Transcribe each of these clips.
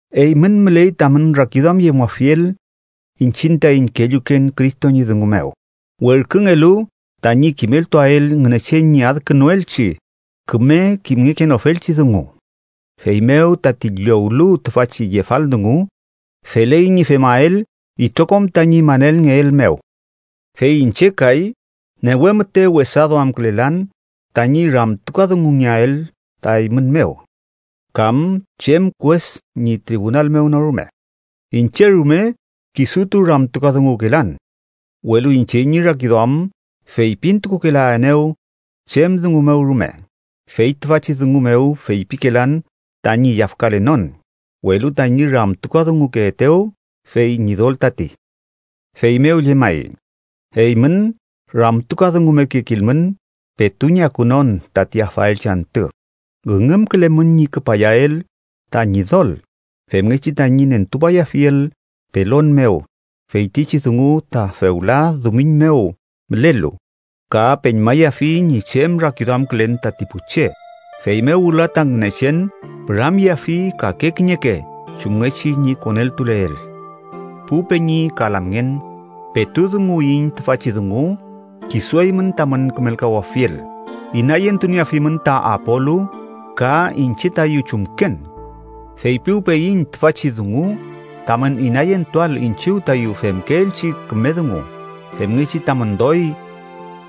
Eymün müley tamün rakiduamyemuafiel iñchiñ taiñ kelluken Cristo ñi dungu mew, werküngelu tañi kimeltuael Ngünechen ñi adkünuelchi küme kimngekenofelchi dungu. Feymew tati llowlu tüfachi yefal dungu, feley ñi femael itrokom tañi manelngeel mew. Fey iñche kay, newe müte wesa duamkülelan tañi ramtukadungungeael ta eymün mew kam chem kues ñi tribunal mew no rume. Iñche rume kisutu ramtukadunguwkelan. Welu iñche ñi rakiduam feypintukukelaenew chem dungu mew rume, fey tüfachi dungu mew feypikelan tañi yafkalenon, welu tañi ramtukadungukeetew, fey Ñidol tati. Feymew llemay, eymün ramtukadungumekekilmün petu ñi akunon tati afaelchi antü. Üngümkülemün ñi küpayael ta Ñidol femngechi tañi nentupayafiel pelon mew feytichi dungu ta fewla dumiñ mew mülelu ka peñmayafi ñi chem rakiduamkülen tati pu che. Feymew wüla ta Ngünechen püramyeafi kake kiñeke chumngechi ñi koneltuleel. Pu peñi ka lamngen, petu dunguwiyiñ tüfachi dungu kisu eymün tamün kümelkawafiel inayentunieafimün ta Apolu ka iñche tayu chumken. Feypiwpeyiñ tüfachi dungu tamün inayentuael iñchiw tayu femkeelchi küme dungu, femngechi tamün doy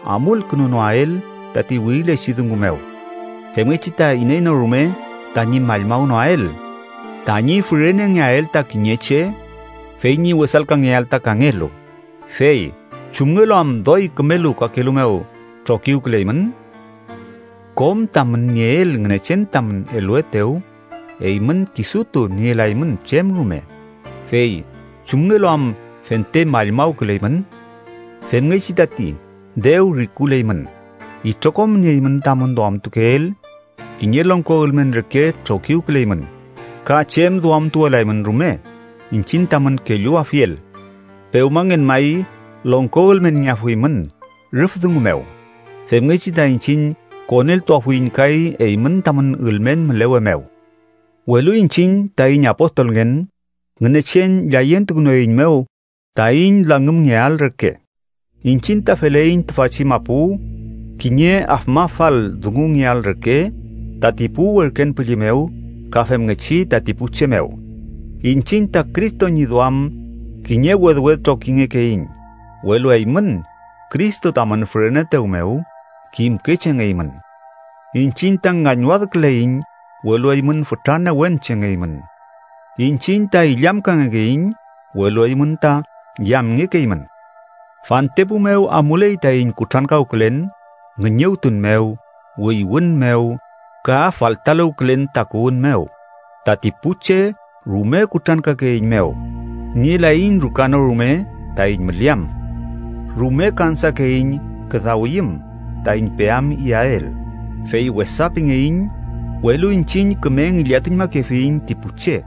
amulkünunoael tati wirilechi dungu mew, femngechi ta iney no rume tañi mallmawnoael tañi fürenengeael ta kiñe che, fey ñi wesalkangeael ta kangelu. Fey ¿chumngelu am doy kümelu kakelu mew trokiwküleymün? Kom tamün nieel Ngünechen tamün eluetew. Eymün kisutu nielaymün chem rume, fey ¿chumngelu am fente mallmawküleymün? Femngechi tati dew rikuleymün, itrokom nieymün tamün duamtukeel kiñe longko ülmen reke trokiwküleymün ka chem duamtuwelaymün rume iñchiñ tamün kelluafiel. ¡Pewmangen may longko ülmenngeafuymün rüf dungu mew, femngechi ta iñchiñ koneltuafuiñ kay eymün tamün ülmen mülewe mew! Welu iñchiñ taiñ apostolngen, Ngünechen llayentukünueiñmew taiñ langümngeael reke. Iñchiñ ta feleiñ tüfachi mapu kiñe afmafal dungungeael reke tati pu werken püllü mew ka femngechi tati pu che mew. Iñchiñ ta Cristo ñi duam kiñe wedwed trokingekeiñ, welu eymün Cristo tamün füreneetew mew kimke chengeymün. Iñchiñ ta ngañwadküleiñ, welu eymün fütra newen chengeymün. Iñchiñ ta illamkangekeiñ, welu eymün ta yamngekeymün Fantepu mew amuley taiñ kutrankawkülen ngüñüwtun mew, wüywün mew, ka faltaluwkülen takuwün mew, tati pu che rume kutrankakeeiñmew, nielaiñ ruka no rume taiñ müleam. Rume kansakeiñ küdawiyüm taiñ peam iyael. Fey wesa pingeiñ, welu iñchiñ küme ngillatuñmakefiyiñ ti pu che.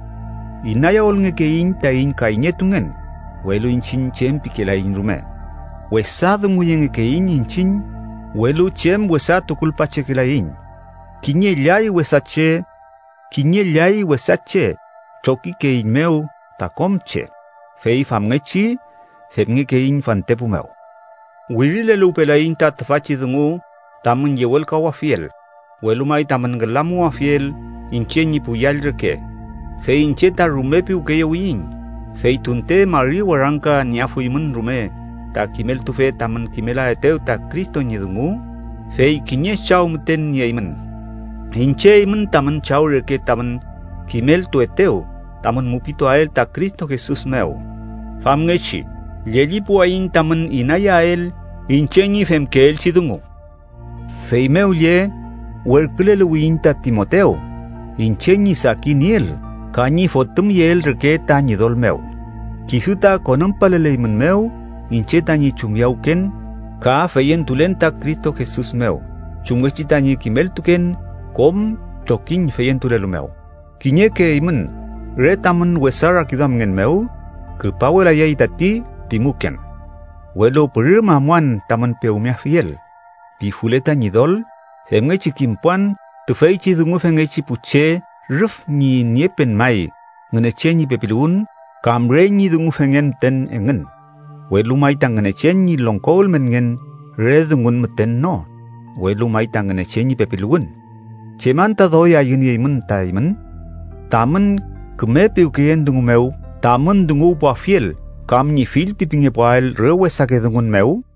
Inayawülngekeiñ taiñ kayñetungen, welu iñchiñ chem pikelaiñ rume. Wesa dunguyengekeiñ iñchiñ, welu chem wesa tukulpachekelaiñ. Kiñe llay wesa che trokikeeiñmew ta kom che. Fey famngechi femngekeiñ fantepu mew. Wirileluwpelayiñ ta tüfachi dungu tamün yewelkawafiel, welu may tamün ngülamuwafiel, iñche ñi pu yall reke, fey iñche ta rume piwkeyewiyiñ. Fey tunte mari warangka nieafuymün rume ta kimeltufe tamün kimelaetew ta Cristo ñi dungu, fey kiñe chaw müten nieymün. Iñche eymün tamün chaw reke tamün kimeltuetew tamün mupituael ta Cristo Jesus mew. Famngechi, llellipuwayiñ tamün inayeael iñche ñi femkeelchi dungu. Feymew lle werküleluwiyiñ ta Timotew, iñche ñi sakinieel ka ñi fotümyeel reke ta Ñidol mew. Kisu ta konümpaleleymünmew iñche tañi chumyawken ka feyentulen ta Cristo Jesus mew, chumngechi tañi kimeltuken kom trokiñ feyentulelu mew. Kiñeke eymün re tamün wesa rakiduamngen mew “küpawelayay tati” pimuken. Welu pürüm amuan tamün pewmeafiel, pifule ta Ñidol, femngechi kimpuan tüfeychi dungufengechi pu che rüf ñi niepen may Ngünechen ñi pepiluwün kam re ñi dungufengen müten engün. Welu may ta Ngünechen ñi longko ülmenngen re dungun müten no, welu may ta Ngünechen ñi pepiluwün. ¿Chem anta doy ayünieymün ta eymün? ¿Tamün küme piwkeyen dungu mew tamün dunguwpuafiel kam ñi fillpipingepuael re wesake dungun mew?